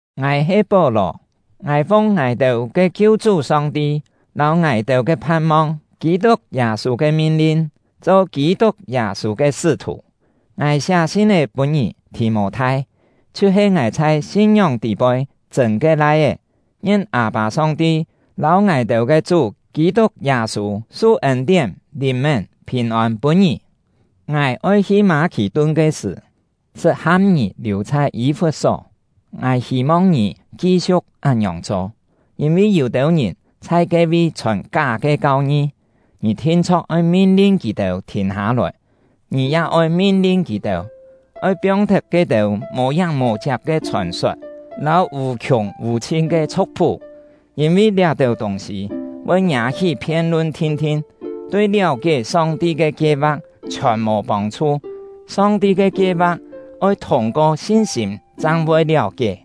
Ngài he Pó-lò; ngài fung ngài-têu ke Kiu-chú Song-ti lâu ngài-têu ke phan-mong Kî-tuk Yâ-sû ke min-lin, cho Kî-tuk Yâ-sû ke sṳ́-thù. Ngài siá sin-é pûn ngì — Thì-mô-thai, chhiu-he ngài chhai sin-ngióng tî-poi chṳ̂n ke lai-é: Ngien Â-pâ Song-ti lâu ngài-têu ke Chú Kî-tuk Yâ-sû su ên-tién, lìn-mén, phìn-ôn pûn ngì! Ngài oi hi Mâ-khì-tun ke sṳ̀, sṳt ham ngì liù chhai Yî-fut-só; ngài hî-mong ngì ki-siu̍k án-ngiòng cho. Yîn-vi yû-têu ngìn chhai ke-vi chhòn ká ke kau-ngi, ngì thin-chho̍k oi min-lin kì-têu thìn hâ-lòi. Ngì ya oi min-lin kì-têu, oi piong-thet ke-têu mò-yáng mò-chiak ke chhòn-sot lâu vù-khiùng vù-chhin ke chhu̍k-phú; yîn-vi liá-têu tûng-sî voi ngiâ-hí phien-lun thin-thin, tui liáu-kié Song-ti ke kie-va̍k chhiòn mò pông-chhu. Song-ti ke kie-va̍k oi thûng-ko sin-sîm chang voi liáu-kié.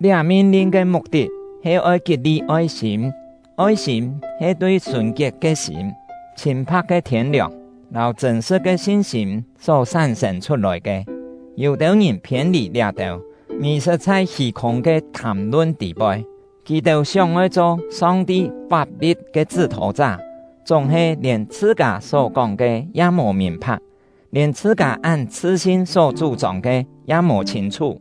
Liá min-lin ke muk-tit he oi kit-li oi-sîm; oi-sîm he tui sùn-kiet ke sîm, chhîn-pha̍k ke thiên-liòng, lâu chṳ̂n-sṳ̍t ke sin-sîm só sán-sên chhut-lòi ke. Yû-têu ngìn phiên-lì liá-têu, mì-sṳt chhai hî-khûng ke thàm-lun tî-poi. Kì-têu sióng-oi cho Song-ti fap-li̍t ke chṳ́-thô-chá, chúng-he, lièn chhṳ-kâ só kóng ke ya mò mìn-pha̍k, lièn chhṳ-kâ án chhṳ-sin só chú-chông ke ya mò chhîn-chhú.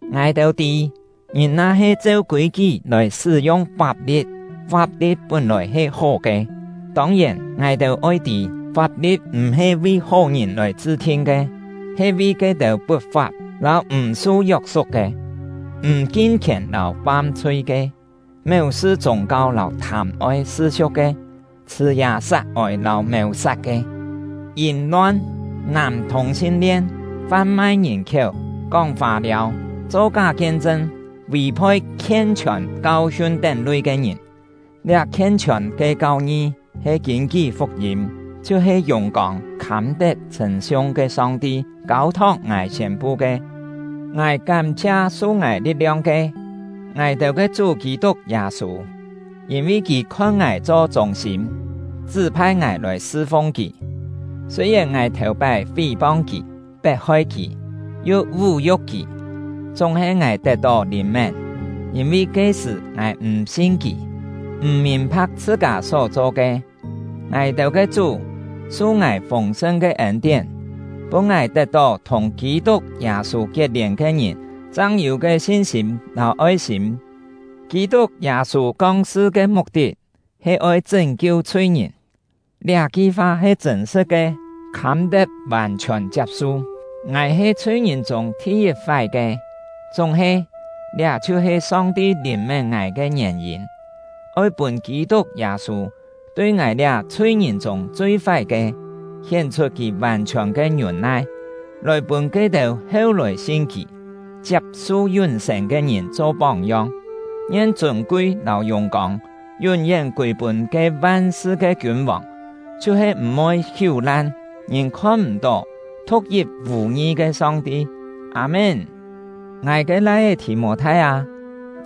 Ngài-têu tî, ngìn na-he cheu kûi-kí lòi sṳ́-yung fap-li̍t, fap-li̍t pún-lòi he hó ke. Tông-yèn, ngài-têu oi tî: Fap-li̍t m̀-he vi hó-ngìn lòi chṳ-thin ke, he vi ke-têu put-fap lâu m̀ su yok-suk ke, m̀ kin-khièn lâu fam-chhui ke, méu-sṳ chûng-kau lâu thâm-oi sṳ-siu̍k ke, chhṳ̀ yà sat ôi lâu mèu-sat ke, yìm-lon, nàm thùng-sin-lien, fan-mai ngìn-khiéu, kóng fâ-liâu, cho ká kien-chṳn, vì-phoi khien-chhiòn kau-hiun tén lui ke ngìn. Liá khien-chhiòn ke kau-ngi he kîn-kí fuk-yîm, chhiu-he yùng-kông, khâm-tet chhṳ̂n-siung ke Song-ti kâu-thok ngài siên-pu ke. Ngài kám-chhia su ngài li̍t-liong ke — ngài-têu ke Chú Kî-tuk Yâ-sû! Yîn-vi kì khon ngài cho chûng-sîm, chṳ́-phai ngài lòi sṳ-fung kì. Sûi-yèn ngài thèu-pái fí-pong kì, pet-hoi kì, yu vú-yu̍k kì, chúng-he ngài tet-tó lìn-mén; yîn-vi ke-sṳ̀ ngài m̀ sin kì, m̀ mìn-pha̍k chhṳ-kâ só-cho ke. Ngài-têu ke Chú su ngài fûng-sṳn ke ên-tién, pûn ngài tet-tó thùng Kî-tuk Yâ-sû kiet-lièn ke ngìn chang yû ke sin-sîm lâu oi-sîm. “Kî-tuk Yâ-sû kong-sṳ ke muk-tit he oi chṳ́n-kiu chhui-ngìn”, liá-ki fa he chṳ̂n-sṳ̍t ke, khâm-tet vàn-chhiòn chiap-su. Ngài he chhui-ngìn chûng thi-yit fái ke; chúng-he, liá chhiu-he Song-ti lìn-mén ngài ke ngièn-yîn, oi pûn Kî-tuk Yâ-sû tui ngài liá chhui-ngìn chûng chui fái ke, hién-chhut kì vàn-chhiòn ke ngiûn-nai, lòi pûn ke-têu heu-lòi sin kì, chiap-su yún-sên ke ngìn cho póng-yong. Ngien chûn-kui lâu yùng-kông yún-yén kûi-pûn ke van-sṳ ke kiûn-vòng, chhiu-he m̀-voi hiú-lan, ngìn khon-m̀-tó, thu̍k-yit vù-ngi ke Song-ti! Â-mén. Ngài ke lai-é Thì-mô-thai â,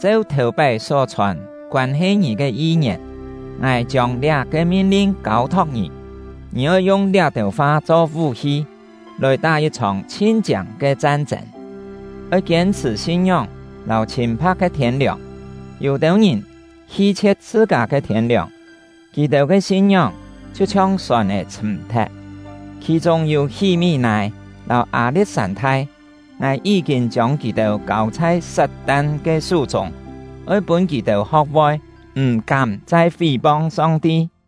cheu thèu-pái só-chhòn koân-he ngì ke yi-ngièn, ngài chiông liá-ke min-lin kâu-thok ngì. Ngì oi yung liá-têu fa cho vú-hi, lòi tá yit-chhòng chhin-chiâng ke chan-chên. Oi kiên-chhṳ̀ sin-ngióng lâu chhîn-pha̍k ke thiên-liòng. Yû-têu ngìn hi-chhie̍t chhṳ-kâ ke thiên-liòng, kì-têu ke sin-ngióng chhiu-chhiong sòn-è chhṳ̀m-thet. Khì-chûng yû Hí-mí-nâi lâu Â-li̍t-sân-thai; ngài yí-kîn chiông kì-têu kâu chhai Sat-tan ke sú-chûng, oi pûn kì-têu ho̍k-voi m̀-kám chai fí-pong Song-ti.